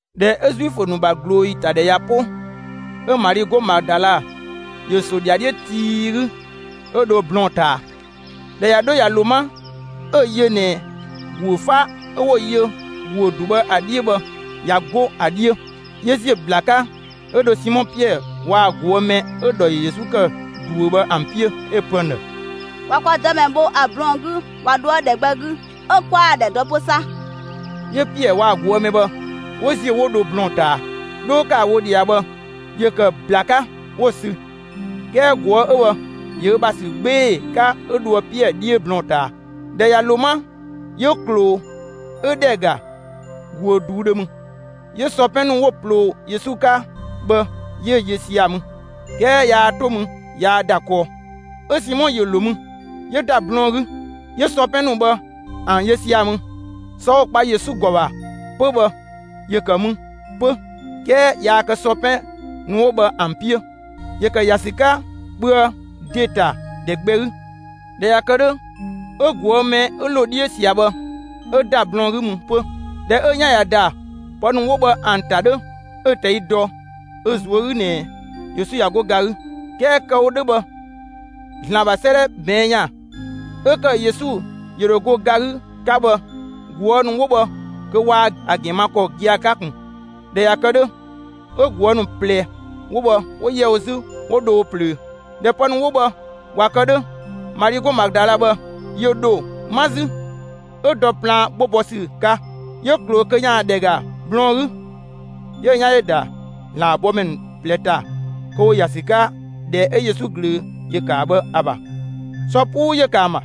꞊Dhɛ 'ö Zuifö ‑nu ‑bha ꞊glooyi ‑ta ‑dhɛ ꞊ya 'po, 'ö Mali 'go Madala ‑yö ‑so ‑dhiadhiö tii 'gü, 'ö dho blɔɔn‑ ꞊taa. ꞊Dhɛ ꞊ya 'dho ꞊ya ‑lo 'ma, 'ö‑ yö ꞊nɛ ‑guö 'fa 'ö 'wo‑ yö ‑guö ‑du bhë ‑a 'dhiö bhë, ꞊ya 'go ‑a 'dhiö. 'Yö ‑ziö ‑bla 'ka 'ö dho Simɔ Piɛɛ waa‑ ꞊guë' mɛ 'ö‑ ‑dhɔ ‑yö Yesu ‑kë ꞊duö bhë ‑an 'piö, 'ö‑ pö ‑an ‑dhë: «꞊Wa kwa Dëmɛ bho ‑a blɔɔn‑ 'gü ꞊wa dhoë ‑dhɛ gbɛ 'gü, 'ö 'kwaa‑ ‑dhɛ dɔ 'pö 'sa.» 'Yö Piɛɛ waa‑ ꞊guë' mɛ bhë 'wo ‑ziö, 'wo dho blɔɔn‑ ꞊taa. 'Dho 'wo ‑kë ‑a wo ꞊dhia bhë, ‑yö ‑kë ‑bla 'ka 'wo‑ sü; 'kɛɛ ꞊guë' 'ö bhë ‑yö ö ‑bha ‑sü 'gbee‑ 'ka 'ö dhoë Piɛɛ 'dhiö blɔɔn‑ ꞊taa. ꞊Dhɛ ꞊ya ‑lo 'ma, 'yö ꞊kloo 'ö ‑dhɛ ‑ga ‑guö ꞊duudhö mü. 'Yö sɔ 'pɛn ‑nu 'wo‑ ꞊ploo Yesu 'ka bhë, 'yö‑ yö sia‑ mü. 'Kɛɛ yaa 'to mü yaa ‑da kɔɔ. 'Ö Simɔ ‑yö ‑lo mü, 'yö ‑da blɔɔn‑ 'gü; 'yö sɔ 'pɛn ‑nu bhë ‑an yö sia‑ mü. Sɔ 'wo‑ kpa Yesu ‑gɔ ‑bha 'pö bhë ‑yö ‑kë mü 'pö, 'kɛɛ yaa kë sɔ 'pɛn ‑nu 'wo bhë ‑an 'piö. ‑Yö ‑kë ‑ya ‑sü 'ka kpöë ‑de ‑ta ‑dhɛ gbɛ 'gü. ꞊Dhɛ ꞊ya kë 'dhö, 'ö ꞊guë' mɛ 'ö ‑lo 'dhiö ꞊sia bhë, 'ö ‑da blɔɔn‑ 'gü mü 'pö. ꞊Dhɛ 'ö‑ 'yan ‑ya ‑da pë ‑nu 'wo bhë ‑an ‑ta 'dhö, 'ö‑ ꞊tɛi' dɔ ö ꞊zuö' 'gü ꞊nɛ Yesu ꞊ya 'go ga 'gü. 'Kɛɛ kë‑ wo 'dhö bhë, ‑Zlan ‑bha 'sëëdhɛ ꞊bɛɛn' ‑yan 'ö ‑kë Yesu ‑yö ‑dho go ga 'gü 'ka bhë, ꞊guë' ‑nu 'wo bhë kö waa‑ ‑gɛn ma ‑a ‑gɛn ma ‑kɔ gia‑ 'ka ꞊kun. ꞊Dhɛ ꞊ya kë 'dhö, 'ö ꞊guë' ‑nu ꞊plɛ 'wo bhë 'wo ‑yɛ wo 'zü, 'wo dho wo ꞊plöö. ꞊Dhɛ pë ‑nu 'wo bhë ꞊wa kë 'dhö, Mali 'go Madala bhë, ‑yö ‑dho 'ma 'zü; 'ö dɔ plaan 'gbo bɔ ‑sü 'ka. 'Yö ꞊kloo kö ‑yaan ‑dhɛ ‑ga blɔɔn‑ 'gü. 'Yö‑ 'yan ‑yö ‑da ‑Zlan ‑bha bɔmɛ ‑nu ꞊plɛ ‑ta kö ‑wo ‑ya ‑sü 'ka ‑dhɛ 'ö Yesu ꞊glöö ‑yö ‑kë ‑a ‑bha bhë ‑a ‑bha; sɔ 'puu ‑yö ‑kë ‑an ‑bha.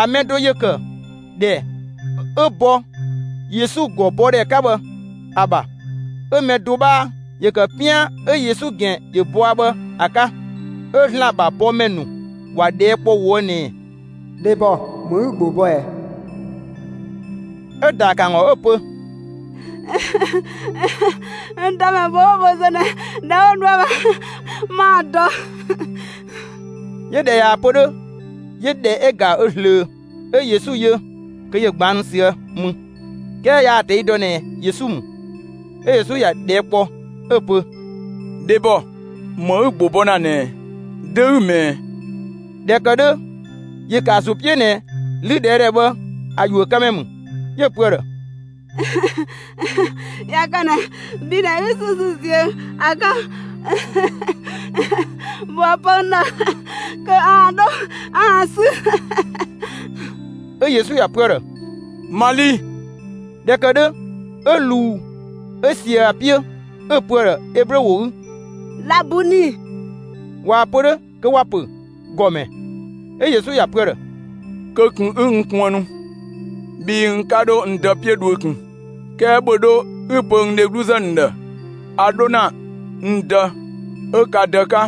‑A mɛ do ‑yö ‑kë ‑dhɛ 'ö bɔ Yesu ‑gɔ bɔ ‑dhɛ 'ka bhë ‑a ‑bha, 'ö‑ mɛ do 'bhaa ‑yö ‑kë 'pian 'ö Yesu ‑gɛn ‑yö bɔa bhë ‑a 'ka. 'Ö ‑Zlan ‑bha bɔmɛ ‑nu ‑wa ꞊dhɛɛ' kpɔ ꞊woë' ꞊nɛɛ: «Dhebɔ, ‑më 'ü‑ ‑gbo bɔ ꞊ɛ?» 'Ö‑ ‑daa ‑kë ‑an ‑gɔ 'ö‑ pö: «N Dëmɛ bho 'wo‑ wo zö ꞊nɛ, ‑dhɛ 'wo dhoë ‑a ‑bha, 'maa‑ dɔ.» 'Yö ꞊dhɛ ꞊yaa‑ pö 'dhö, 'yö ‑dhɛ ‑ga ö ꞊zlöö; 'ö Yesu yö kö ‑yö ꞊gbaannu ꞊süë' mü, 'kɛɛ yaa‑ ꞊tɛi' dɔ ꞊nɛ Yesu ‑mü. 'Ö Yesu ‑ya ꞊dhɛɛ' kpɔ 'ö‑ pö: «Dhebɔ, ‑më 'ü‑ ‑gbo bɔ ‑na ꞊nɛ ꞊ɛ? Dö 'ü‑ ꞊mɛɛ?» ꞊Dhɛ ‑kë 'dhö, ‑yö ‑kë ‑a ‑zo 'piö ꞊nɛ 'lüdhɛɛdhɛ bhë ‑a ‑yuökëmɛ ‑mü; 'yö‑ pö ‑a ‑dhë: «꞊Ya kë ꞊nɛ bhi ꞊nɛ 'ü‑ sü 'ü ‑ziö ‑a 'ka, ‑bhöë pö n ‑dhë kö 'aan‑ dho 'aan‑ 'sü.» 'Ö Yesu ‑ya pö ‑a ‑dhë: «Mali!» ꞊Dhɛ ‑kë 'dhö 'ö ꞊luu 'ö ꞊sië ‑a 'piö, 'ö‑ pö ‑a ‑dhë Eblö ‑wo 'gü: «Labuni!» (꞊Waa‑ pö 'dhö kö ‑wa ‑pö «‑Gɔmɛ».) 'Ö Yesu ‑ya pö ‑a ‑dhë: «Kö ꞊kun 'ü n kuënnu, bhii n 'ka dho n Dë 'piö dhuö ꞊kun. 'Kɛɛ ‑bhö 'dho 'ü‑ pö n dhegluzë ‑nu ‑dhë a 'dho ‑na n Dë 'ö ka Dë 'ka,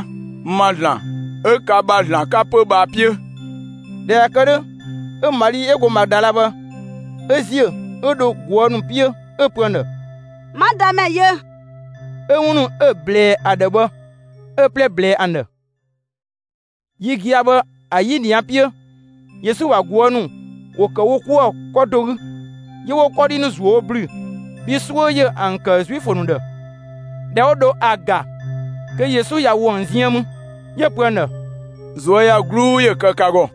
n ‑ma ‑Zlan 'ö ka ‑bha ‑Zlan 'ka 'pö bhë ‑a 'piö.» ꞊Dhɛ ꞊ya kë 'dhö, 'ö Mali 'ö go Madala bhë 'ö ‑ziö, 'ö dho ꞊guë' ‑nu 'piö 'ö‑ pö ‑an ‑dhë: «'Ma Dëmɛ yö!» 'Ö 'wun ‑nu 'ö‑ ꞊blɛɛ ‑a ‑dhë bhë 'ö‑ 'plɛ ꞊blɛɛ ‑an ‑dhë. Yi gia‑ bhë ‑a 'yinia 'piö, Yesu ‑bha ꞊guë' ‑nu ‑wo ‑kë wo 'kuë‑ 'kɔ do 'gü. 'Yö 'wo 'kɔdhi ‑nu ‑zuö wo ‑blü bhii 'suö ‑yö ‑an ‑kë Zuifö ‑nu ‑dhë. ꞊Dhɛ 'wo dho ‑a ‑ga kö Yesu ꞊ya ‑wo ‑an ziën mü. 'Yö‑ pö ‑an ‑dhë: «꞊Zuöyagluu ‑yö kë ka ‑gɔ!»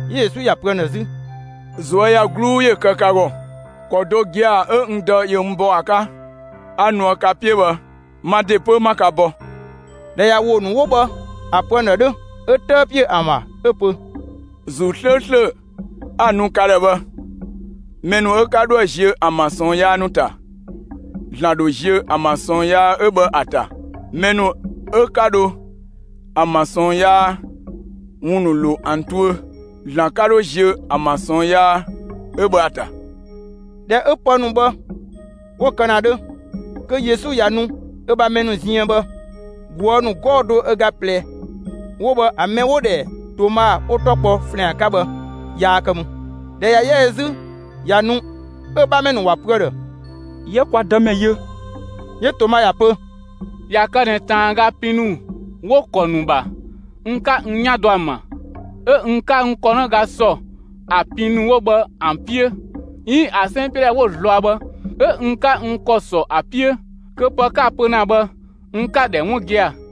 'Yö Yesu ‑ya pö ‑an ‑dhë 'zü: «꞊Zuöyagluu ‑yö kë ka ‑gɔ! ‑Kɔ do gia‑ 'ö n Dë ‑yö n bɔ ‑a 'ka 'a nuë ka 'piö bhë, ma ‑de 'pö 'ma ka bɔ.» ꞊Dhɛ ꞊ya ‑wo ‑nu 'wo bhë ‑a pö ‑an ‑dhë 'dhö, 'ö 'tëë ‑piö ‑an ‑bha 'ö‑ pö: «‑Zuu 'slööslö 'a‑ nu ka ‑dhë bhë! Mɛ ‑nu 'ö 'ka 'dhoë‑ ziö ‑an ‑bha ꞊sɔɔn yaa ‑nu ‑ta, ‑Zlan ‑dho ziö ‑an ‑bha ꞊sɔɔn yaa 'ö bhë ‑a ‑ta; mɛ ‑nu 'ö 'ka dho ‑an ‑bha ꞊sɔɔn yaa ‑wun ‑nu ‑lo ‑an tuö, ‑Zlan 'ka 'dhö ziö ‑an ‑bha ꞊sɔɔn yaa 'ö bhë ‑a ‑ta.» ꞊Dhɛ 'ö pë ‑nu bhë 'wo kë ‑na 'dhö, kö Yesu ꞊ya nu ö ‑bha mɛ ‑nu ziën bhë, ꞊guë' ‑nu 'gɔɔ‑ do ö ꞊ga ꞊plɛ 'wo bhë ‑a mɛ 'wo‑ ‑dhɛ Toma 'wo‑ 'tɔ kpɔ ‑Flɛan 'ka bhë, yaa kë mü. ꞊Dhɛ ꞊ya 'yɛ ö 'zü ꞊ya nu, 'ö‑ 'bhamɛ ‑nu ‑wa pö ‑a ‑dhë: «'Yië kwa Dëmɛ yö.» 'Yö Toma ‑ya pö: «꞊Ya kë ꞊nɛ ꞊taanga pin ‑nu 'wo‑ ‑kɔ ‑nu ‑bha n 'ka n 'yan dɔ ‑an ‑bha, 'ö n 'ka n ‑kɔnëga ‑sɔ ‑a pin ‑nu 'wo bhë ‑an 'piö, 'iin ‑a 'sɛn 'piö ‑dhɛ 'wo‑ zlɔa bhë 'ö n 'ka n ‑kɔ ‑sɔ ‑a 'piö, kö pë 'ka‑ pö ‑na bhë n 'ka‑ ‑dhɛ 'wun gia‑.»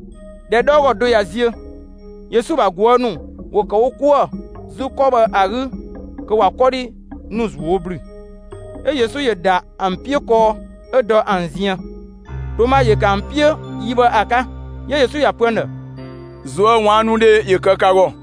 ꞊Dhɛ 'dhɔɔgɔ do ꞊ya ziö, Yesu ‑bha ꞊guë' ‑nu ‑wo ‑kë wo 'kuë‑ 'zü 'kɔ bhë ‑a 'gü kö ꞊wa 'kɔdhi ‑nu ‑zuö wo ‑blü, 'ö Yesu ‑yö ‑da ‑an 'piö kɔɔ 'ö dɔ ‑an ziën. Toma ‑yö ‑kë ‑an 'piö yi bhë ‑a 'ka. 'Yö Yesu ‑ya pö ‑an ‑dhë: «꞊Zuöwaannudhe ‑yö kë ka ‑gɔ!»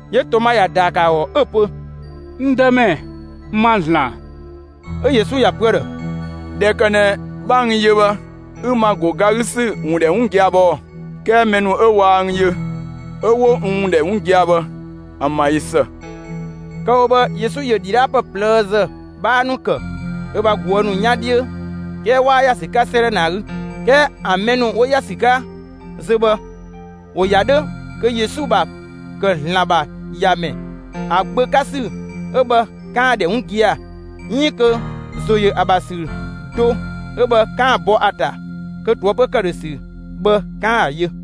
'Yö Toma ‑ya ‑daa ‑kë ‑a ‑gɔ 'ö‑ pö: «N Dëmɛ, ma ‑Zlan!» 'Ö Yesu ‑ya pö ‑a ‑dhë: «꞊Dhɛ ‑kë ꞊nɛ 'bha n yö bhë, 'ü n ‑ma ‑go ga 'gü ‑sü ‑wun ‑dhɛ 'wun gia‑ bhë ɔɔ? 'Kɛɛ mɛ ‑nu 'ö waa n yö 'ö 'wo n ‑wun ‑dhɛ 'wun gia‑ bhë, ‑an ‑bha ꞊yö ‑së!» Kë‑ wo bhë Yesu ‑yö ‑dhidhaapë ꞊plëëzë 'bhaa ‑nu ‑kë ö ‑bha ꞊guë' ‑nu 'yan 'dhiö, 'kɛɛ 'waa ‑ya ‑sü 'ka 'sëëdhɛ ꞊nɛ ‑a 'gü. 'Kɛɛ ‑an mɛ ‑nu 'wo ‑ya ‑sü 'ka zö bhë, ‑wo ‑ya 'dhö kö Yesu ‑bha ‑kë ‑Zlan ‑bha ‑Yamɛ, ‑a Gbö 'ka ‑sü 'ö bhë 'kaan‑ ‑dhɛ 'wun gia‑, 'iin kö ‑zo ‑yö ‑a ‑bha ‑sü do 'ö bhë 'kaan‑ bɔ ‑a ‑ta kö ꞊toëpö ‑këdhösü bhë 'kaan‑ ‑a yö.